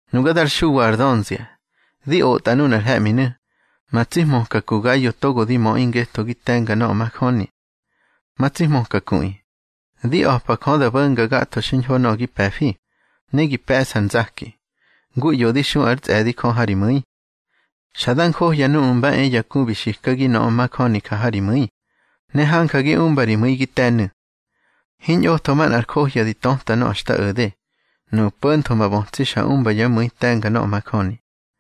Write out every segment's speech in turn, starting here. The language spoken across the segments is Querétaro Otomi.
Nuga dar Xuwa ar dönzia, di otꞌa nunar he̱ꞌminu̱, ma tsi hmöka ku Gayo togo di möꞌi ngetho gi te̱nga nöꞌö majöni. Ma tsi hmöka kuꞌi, di a̱pa Jö da bo̱nga gatho xiñho nöꞌö gi pe̱fi, ne gi pe̱ꞌsa ar nzaki, ngu ꞌyo di xu ár tsꞌe̱di Jö ha ri mu̱i. Xa da njohya núꞌmu̱ mba e ya ku bi xikagi nöꞌö majöni ja ha ri mu̱i, ne hanja gi umba ri mu̱i gi te̱nu̱. Hiñꞌotho manꞌar johya di töta nöꞌö xta o̱de, nuꞌu̱ po̱ntho ma bötsi xa umba yá mu̱i te̱nga nöꞌö majöni.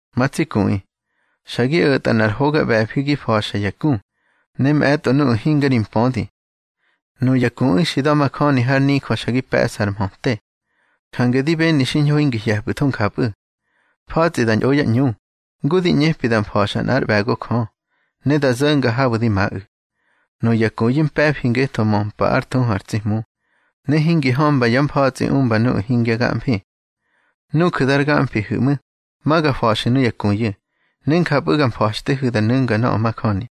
Ma tsi kuꞌi, xa gi o̱tꞌa nꞌar hoga ꞌbe̱fi gi fa̱xa ya ku, ne mꞌe̱tꞌo nuꞌu̱ hinga ri mpödi. Nuya kuꞌu̱ xi da̱majöni har nijö xa gi pe̱ꞌsar mhöte. Jange di beni xiñho hingi hye̱pꞌu̱tho njapꞌu̱. Fa̱tsꞌi da ñꞌo yá ꞌñu, ngu di ꞌñepi da mfa̱xa nꞌár ꞌbe̱go Jö, ne da zo̱nga habu̱ di maꞌu̱. Nuya kuyu̱ mpe̱fi ngetho möpa ár thuhu ar tsi Hmu, ne hingi hömba yá mfa̱tsꞌi umba nuꞌu̱ hingya gamfi. Nuju̱ dar gamfihu̱ꞌmu̱, ma ga fa̱xu̱ nuya kuyu̱, ne njapꞌu̱ ga mfa̱xtehu̱ da nu̱nga nöꞌö majöni.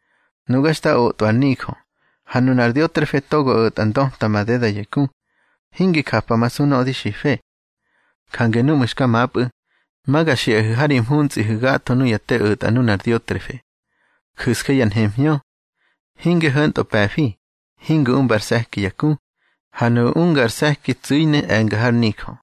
Nuga xta otꞌwa ar nijö, ha nunar Diotrefe togo o̱tꞌa ndöta madeda ya ku, hingi japamasu nöꞌö di xife. Jange nuꞌmu̱ xka mapꞌu̱, ma ga xiꞌahu̱ ha ri mhuntsꞌihu̱ gatho nuya te o̱tꞌa nunar Diotrefe. Ju̱sje ya nhemhñö. Hinge ho̱ntꞌö pe̱fi, hingi umba ar se̱ki ya ku, ha nuꞌu̱ unga ar se̱ki tsu̱i ne e̱nga har nijö.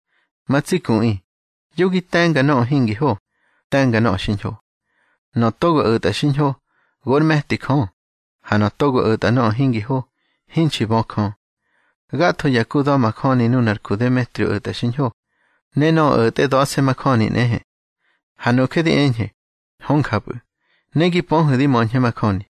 Ma tsi kuꞌi, yo gi te̱nga nöꞌö hingi ho, te̱nga nöꞌö xiñho. Nöꞌö togo o̱tꞌa xiñho, gor me̱ti Jö, ha nöꞌö togo o̱tꞌa nöꞌö hingi ho, hinxi bö Jö. Gatho ya ku da̱majöni, nunar ku Demetrio o̱tꞌa xiñho, ne nöꞌö o̱tꞌe da̱se̱ majöni nꞌehe. Ha nuje di eñhe, hö njapꞌu̱, ne gi pöhu̱ di möñhe majöni.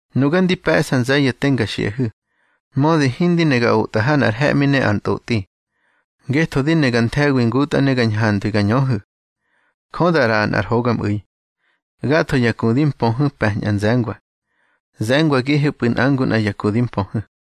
Nuga ndi pe̱ꞌsa nze̱ye̱ te nga xiꞌahu̱, mödi hindi ne ga otꞌa ha nꞌar he̱ꞌmi ne ar ntꞌotꞌi. Ngetho di ne ga nthe̱wi ngutꞌa ne ga ñhandwi ga ñöhu̱. Jö da ꞌraꞌa nꞌar hogamꞌu̱i. Gatho ya ku di mpöhu̱ pe̱ñꞌa nze̱ngwa. Ze̱ngwagihepꞌu̱ nꞌa ngu nꞌa ya ku di mpöhu̱.